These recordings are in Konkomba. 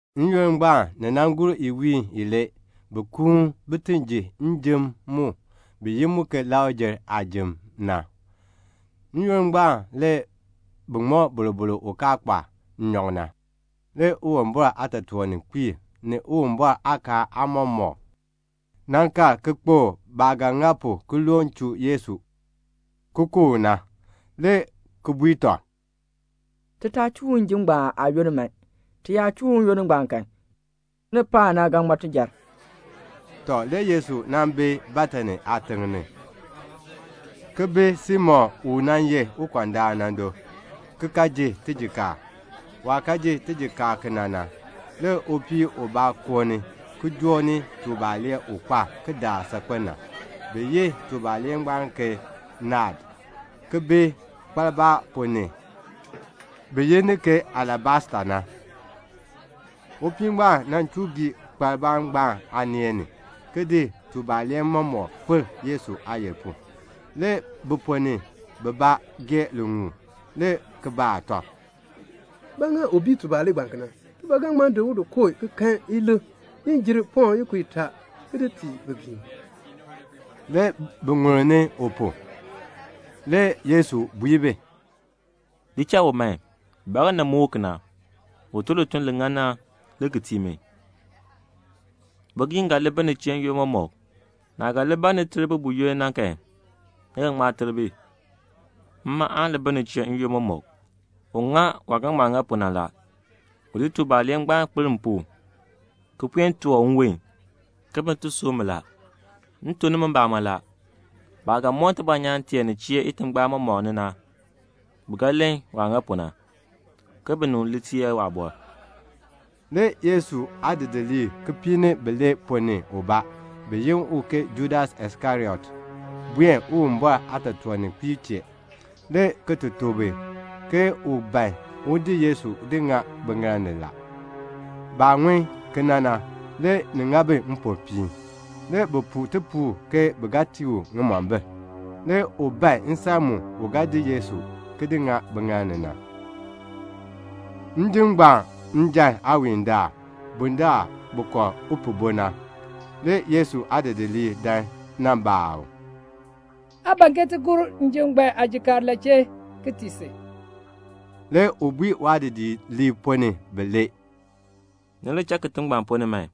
N-yoonn ngbaan, ni gur iwiin ilee, bi kuun bin ti ji njim mu bi yi mu ke Lakr-jer aajim na. N-yoonn ngbaan, le bi ŋmɔ boroboro u kaa kpa nnyɔk na. Le Uwumbɔr aatotoorninkpiib, ni Uwumbɔr aakaal aamɔmɔkb, nan kal kpokl baah ga ŋa pu ki loon chuu Yesu ki ku u na, le ki bui tɔb, "Ti taa chuu u njim ngbaan aayoonn man. Ti yaa chuu u n-yoonn ngbaan kan, kinipaak na ga ŋma tijar." Tɔ, le Yesu nan bi Betani aatiŋ ni, ki bi Simon u nan ye ukɔndaan na do, ki ka ji tijikaar. Waah ji tijikaar kena na, le upii ubaa koo ni ki joo ni tubalee u kpa kidaak saakpen na, bi yi tubalee ngbaan ke naad, ki bi kpaliba ponn ni, bi yi ni ke alabasta. Le upii ngbaan chuu gii kpaliba ngbaan aaneen ni, ki di tubalee mɔmɔk di kpir Yesu aayil pu. Le bi ponn ni bibaa gee liŋuul, le ki baa tɔb, "Ba ŋa u bii tubalee ngbaan kena? Ti ba ga ŋma di u ki di kooh ki kan ilik ni jer pɔŋ ikub itaa, ki di tii bigiim." Le bi ŋulni u pu. Le Yesu bui bi, "Di cha u man. Ba ŋa ni muk u kena? U tun lituln li ŋan na le ki tii mi. Bigiim ga li bi ni chee n-yoonn mɔmɔk. Naah ga li ban ni ter bi buyoonn na kan, ni ga ŋma ter bi. Mma aan li bi ni chee n-yoonn mɔmɔk. U ŋa waah ga ŋma ŋa pu na la. U di tubalee ngbaan ki kpir m pu ki puen toor nwon, ke bin ti sub mi. M tuk nimi mbamɔn la, baah ga moon tibɔnyaan tee nin chee itingbaan mɔmɔk ni na, bi ga len waah ŋa pu na, ke binib li teer waabɔr." Le Yesu aadidiliib kipiik ni bilee ponn ni ubaa, bi yi u ke Judas Iskariot, buen Uwumbɔr aatotoorninkpiib chee, le ki tuk bi ke u ban un di Yesu ki di ŋa biŋaal ni la. Baah ŋun kena na, le ni ŋa bi mpopiin. Le bi puu tipuul ke bi ga tii u ŋimombil. Le u ban nsan mu u ga di Yesu ki di ŋa biŋaal ni na. Njim ngbaan njan aawiindaal, bundaln bi kɔr upihbo na, le Yesu aadidiliib dan nan baa u, "Aa ban ke ti gor njim ngbaan aajikaar la chee ki tii si?" Le u bui waadidiliib ponn ni bilee, "Ni li cha kitiŋ ngbaan ponn ni man.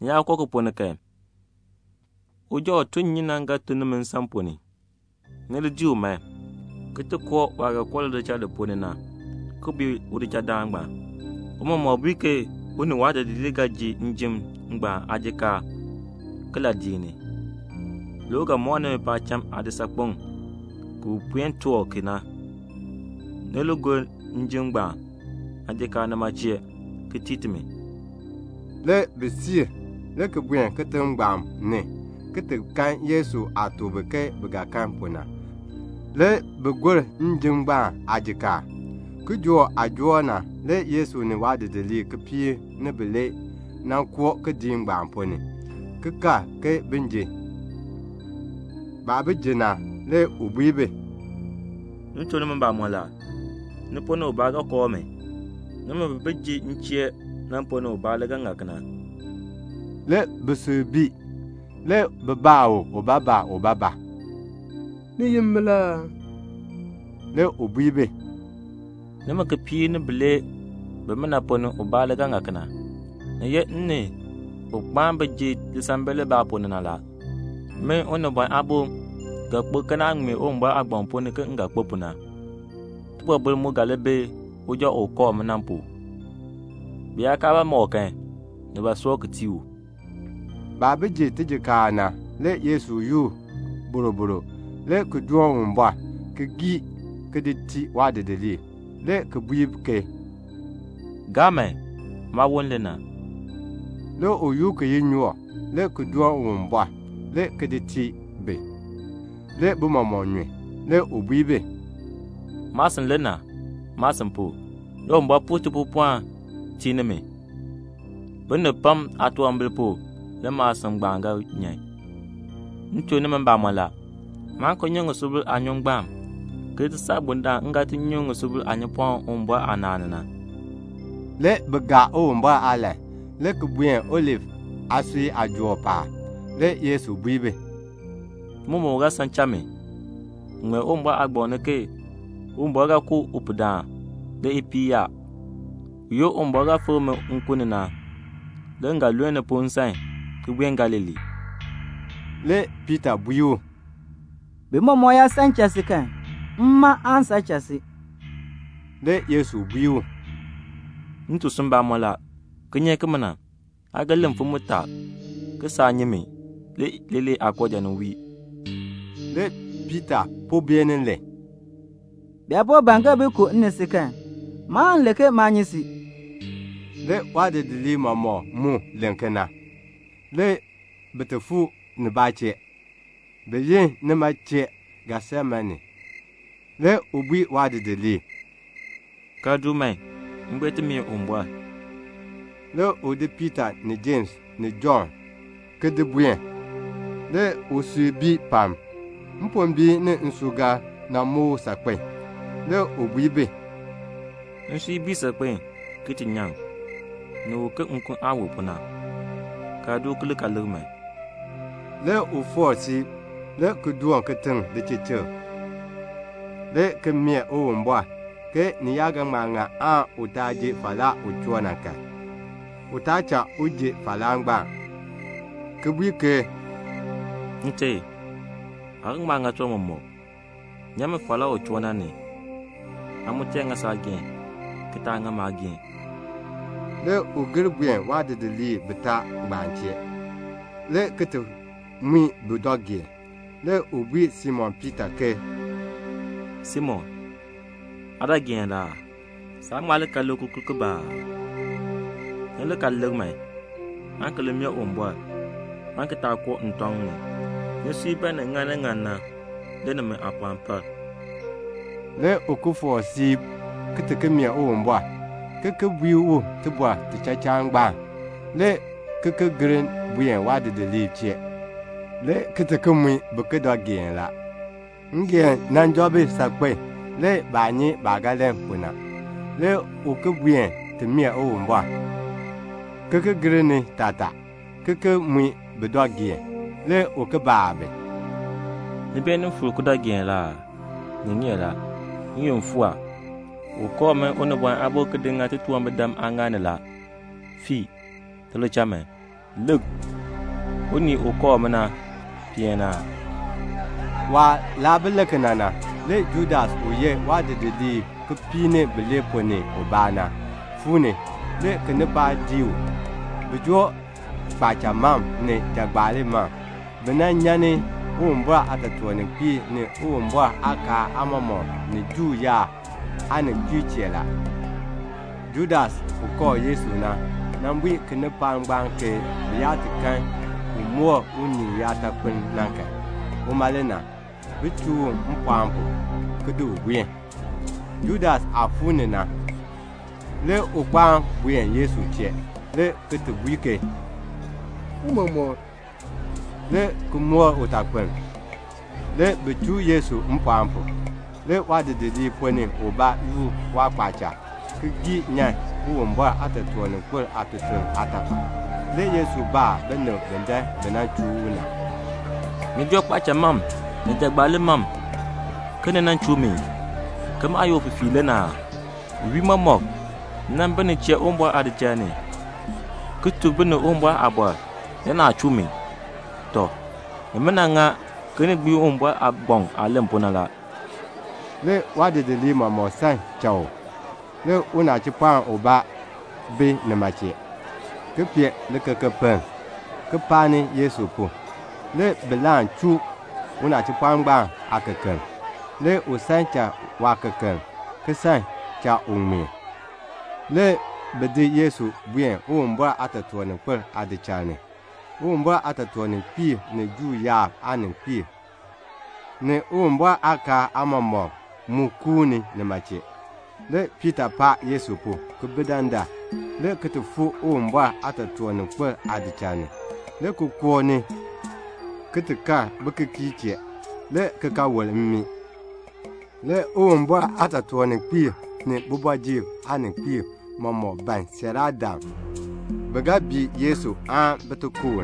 Ni yaa koo ki ponn ni kan, uja u tun nnyun na ga ton nimi nsan ponn ni. Ni li dii u man, ki koo waah ga koo lidichal li ponn ni na, ki bui udichaldaan na, 'Tiicha bui ke u ni waadidiliib ga ji njim ngbaan aajikaar kiladiik ni?' Le u ga mɔk nimi paacham aadisaakpeŋ ki bi puen toor ki na la. Ni li gor njim ngbaan aajikaar ki tii timi, nima chee." Le bi siir, le ki buen kitiŋ ngbaan ni, le ki kan Yesu aah tuk bi ke bi ga kan pu na. Le bi gor njim ngbaan aajikaar. Kijook aah joor na, le Yesu ni waadidiliib kipiik ni bilee na koo kidiik ngbaan ponn ni, ki kal ke bin ji. Baah bi ji na, le u bui bi, "M tuk nimi mbamɔn la, ni ponn ni ubaa ga kooh mi. Nimi bi bi ji m chee na ponn ni ubaa le ga ŋa kena." Le bisui bii. Le bi baa u ubaabaa ubaabaa, "Ni ye min la aa?" Le u bui bi, "Nimi kipiik ni bilee ponn ni ubaa le ga ŋa kena. Ni ye m ni un kpaan bi ji lisambil libaa ponn ni na. Min Unibɔn Aabo ga kpo ke naah ŋmee Uwumbɔr aagbaŋ ponn ni ke m ga kpo pu na. Tibɔbil mu ga li bi uja u ga kooh mi na pu. Bi yaa kaa ba ma u kan, ni ba soor ki tii u." Baah bi ji tijikaar na, le Yesu yoor boroboro, le ki doon Uwumbɔr, le ki gii, le ki di tii waadidiliib, le ki bui ke, "Gaa man. Maawon le na." Le u yoor kiyinyook, le ki doon Uwumbɔr, le ki di tii bi. Le bi mɔmɔk nyun. Le u bui bi, "Maasin le na. Maasin pu, le Uwumbɔr puu tipuupɔln ki tii nimi. Binib pam aatunwambir pu le maasin ngbaan ga nyan. M tuk nimi mbamɔn la, maan ki nyu ŋisubil aanyun ngbaan ki ti saa bundaln m ga ti nyu ŋisubil aanyunpɔm Uwumbɔr aanaan ni na." Le bi gaa Uwumbɔr aalahn, le ki buen Olif aasui aajool paab. Le Yesu bui bi, "Ni mɔmɔk ga san ki cha mi. Ni ŋmee Uwumbɔr aagbaŋ ni ke, 'Uwumbɔr ga ku upihdaan, le ipiih yaa.' Buyoonn Uwumbɔr ga fikr mi nkun ni na, le m ga luln ni pu nsan, ki buen Galilee." Le Piita bui u, "Bi mɔmɔk yaa san ki cha si kan, mma aan san ki cha si." Le Yesu bui u, "M tuk si mbamɔn la, kinyeek kimina, aa ga len mfim mutaa ke saa nyi mi le leelee aakooja nin wii." Le Piita po beenin len, "Bi yaa po ban bin ku m ni si kan, maan len ke maa nyi si." Le waadidiliib mɔmɔk mu len kena. Le bi fuu nibaa chee, le bi yi nima chee Getsemane. Le u bui waadidiliib, "Kaln du man, m buen ti mee Uwumbɔr." Le u di Piita ni Jems ni Jɔnn ki di buen. Le usui bii pam. Tibɔr tibaa muk u saakpen. Le u bui bi, "Nsui bii saakpen a, ki ti nyaŋ. Ni wu ke nkun aah wu pu na. Kaln du ki li lik man." Le u foor siib, le ki doon kitiŋ lichichikr, le ki mee Uwumbɔr ke ni yaa ga ŋma ŋa u taa ji falaa u choo na kan, u taa cha u ji falaa ngbaan, ki bui ke, "Nte, aa ga ŋma ŋa tiwan mɔmɔk. Nyan mi falaa u choo na ni. Amaa ŋa saageehn, ki taa ŋa maageehn." Le u gir buen waadidiliib bitaa ngbaan chee, le ki ti mui bi dɔ geen, le ki bui Simon Piita ke, "Simon, aa dɔ geen la aa? Saa ŋma li kal lik kikurk kibaa aa? Ni li kal lik man, aan ki li mee Uwumbɔr, aan ki taa koo ntɔŋ ni. Nisui ban ni ŋa ni ŋan na, le nimi aapɔɔn par." Le u ki foor siib ki ti mee Uwumbɔr, ki ki bui u tibɔr tichachaan ngbaan. Le u ki gir buen waadidiliib chee, le ki ti mui bi ki dɔ geen la; ngeen joo bi saakpen a. Le baa nyi baah ga len pu na. Le u ki buen ti mee Uwumbɔr, ki ki gir ni taatar, ki ki mui bi dɔ geen, le ki baa bi, "Ni beenin fuur ki dɔ geen la aa? Ni ŋeer a. N-yoonn fuu a. U kooh min Unibɔn Aabo ki di ŋa titunwambirdam aaŋaal ni la. Fiin man, ti li cha man. Lik, un kooh mi na peen ni a." Waah laa bi len kena na, le Judas u ye waadidiliib kipiik ni bilee ponn ni ubaa na, fuu ni a. Le kinipaak dii u. Bi joo kpaacha mam ni jagbaali mam. Bi nyan ni Uwumbɔr aatotoorninkpiib ni Uwumbɔr aakaal aamɔmɔkb ni Juu yaab aaninkpiib chee la. Judas u kooh Yesu na, nan bui kinipaak ngbaan ke bi yaa ti kan u moor unii uyaatakpiln na kan, uma le na. Bin chuu u mpɔɔn pu, ki di u buen. Judas aah fuu ni na, le u kpaan buen Yesu chee, le ki bui ke, "Tiicha," le ki moor utakpiln. Le bi chuu Yesu mpɔɔn pu. Le waadidiliib ponn ni ubaa yoor waakpaacha ki gii nyan Uwumbɔr aatotoorninkpil aatutuln aatafal. Le Yesu baa binib bi dan bi nan chuu u na, "Ni joo kpaacha mam ni jagbaali mam ke ni nan chuu mi, ke maah ye ufifiir le na aa? Iwiin mɔmɔk m nan bi ni chee Uwumbɔr aadichal ni, ki tuk binib Uwumbɔr aaliin, le naa chuu mi. Tɔ, nimina ŋa ke ni gbiin Uwumbɔr aagbaŋ aah len pu na." Le waadidiliib mɔmɔk san ki cha u. Le unachipɔɔn ubaa bi nima chee, ki pee likekepiln, ki paani Yesu pu. Le bi laan chuu unachipɔɔn ngbaan aakekeln. Le u san cha waakekeln, ki san cha u ŋmeen. Le bi di Yesu ki di buen Uwumbɔr aatotoorninkpil aadichal ni. Uwumbɔr aatotoorninkpiib ni Juu yaab aaninkpiib, ni Uwumbɔr aakaal aamɔmɔkb mu kuuni nima chee. Le Piita paan Yesu pu, ki bi dandar, le ki ti fuu Uwumbɔr aatotoorninkpil aachiln ni, le ki koo ni, le ki kal bikikiirb chee, le ki ka wol mmii. Le Uwumbɔr aatotoorninkpiib ni kooti ni aaninkpiib mɔmɔk ban bisiiraadam bi ga bii Yesu na, aan bi ti ku u.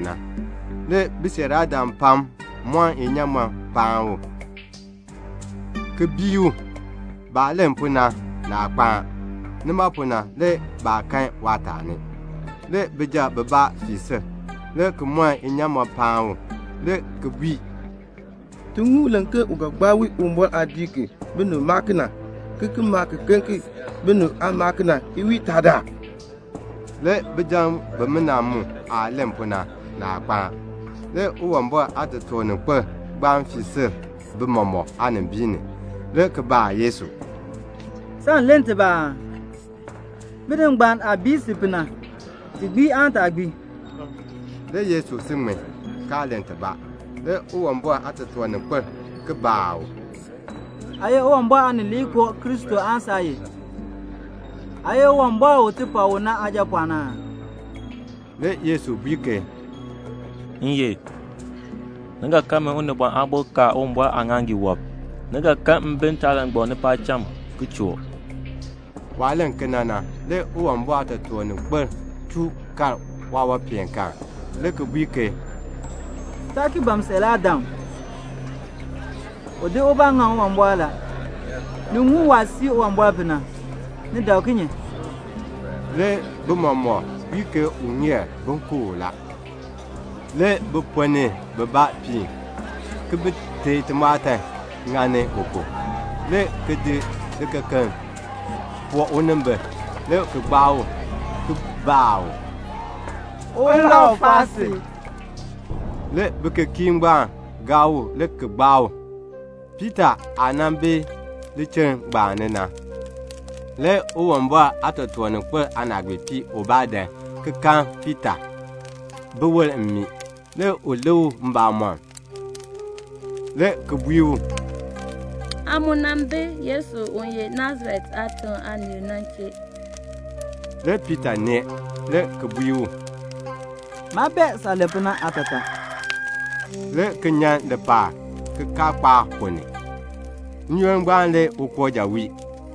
Le bisiiraadam pam mɔn inyaamɔn ki paan u, ki bii u. Baah len pu na, naa kpaan. Nima pu na le baa kan waataani. Le bijab bibaa fii sil, le ki mɔn inyaamɔn paan u, le ki bui, "Ti ŋun u len ke u ga gbaa wii Uwumbɔr aadiik ki binib maa ki na, ki ki maa kiken ki binib aa maa ki na, iwiin itaa." Le bijab bimina mu aah len pu na, naa kpaan. Le Uwumbɔr aatotoorninkpil ngbaan fii sil bi mɔmɔk aanimbiin ni, le ki baa Yesu, "Saan len tibaa aa? Binib ngbaan aah bii si pu na, ti gbii aan taa gbii?" Le Yesu si ŋmin, kaa len tibaa. Le Uwumbɔr aatotoorninkpil ki baa u, "Aa ye Uwumbɔr Aanileekoo Kristo aan saa ye? Aa ye Uwumbɔr u ti pak u na Aajapɔɔn aa?" Le Yesu bui ke, "M ye. Ni ga kan min Unibɔn Aabo ka Uwumbɔr aaŋaaŋgii wɔb. Ni ga kan mi ntaalangbam ni paacham, ki choo." Waah len kena na, le Uwumbɔr aatotoorninkpil chuu kar ubaa aawanpeenkaan, le ki bui ke, "Taa ki ban siiraadam. U di ubaa ŋaŋ Uwumbɔr la. Ni ŋun waah sii Uwumbɔr pu na. Ni dak kinye?" Le bi mɔmɔk bui ke u ŋeer bin ku u la. Le bi ponn ni bibaa piin ki bi teei timɔɔtan ki ŋani u pu, le ki di likekeln ki poo unimbil, le ki gbaa u, ki baa u, "Ulau gbaa si?" Le bikikiirb ngbaan gaa u le ki gbaa u. Le Piita aah bi lichiln ngbaan ni na, le Uwumbɔr aatotoorninkpil aanaagbiipii ubaa dan ki nan kan Piita bi wol mmii. Le u lik u mbamɔm, le ki bui u, "Aa mu nan bi Yesu u ye Nasaret aatiŋ aanii na chee." Le Piita nee, le ki bui u, "Maa bee saah len pu na aatataa," le ki nyan lipaal kikaakpaak ponn ni. N-yoonn ngbaan le ukooja wii.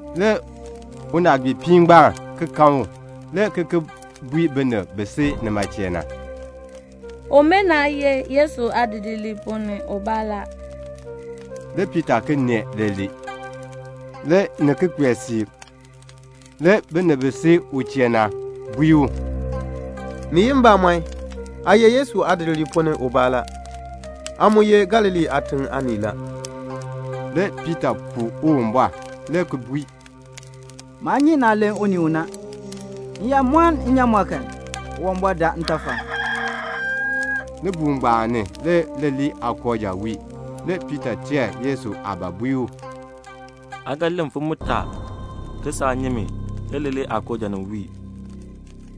Le unaagbiipii ngbaan ki kan u, le ki bui binib bi si nima chee na, "Umina ye Yesu aadidiliib ponn ni ubaa la." Le Piita ki nee leelee. Le ni ki kpee siib, le binib bi si u chee na bui u, "Ni ye mbamɔn, aa ye Yesu aadidiliib ponn ni ubaa la; aa mu ye Galilee aatiŋ aanii la." Le Piita puu Uwumbɔr, le ki bui, "Maa nyi naah len unii u na. M yaa mɔn nnyaamɔn kan, Uwumbɔr daa ntafal." Libuul ngbaan ni, le leelee aakooja wii. Le Piita teer ke Yesu bui u, "Aa ga len mfim mutaa ke saa nyi mi le leelee aakooja nin wii."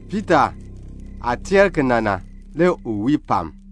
Piita aah teer kena na, le u wii pam.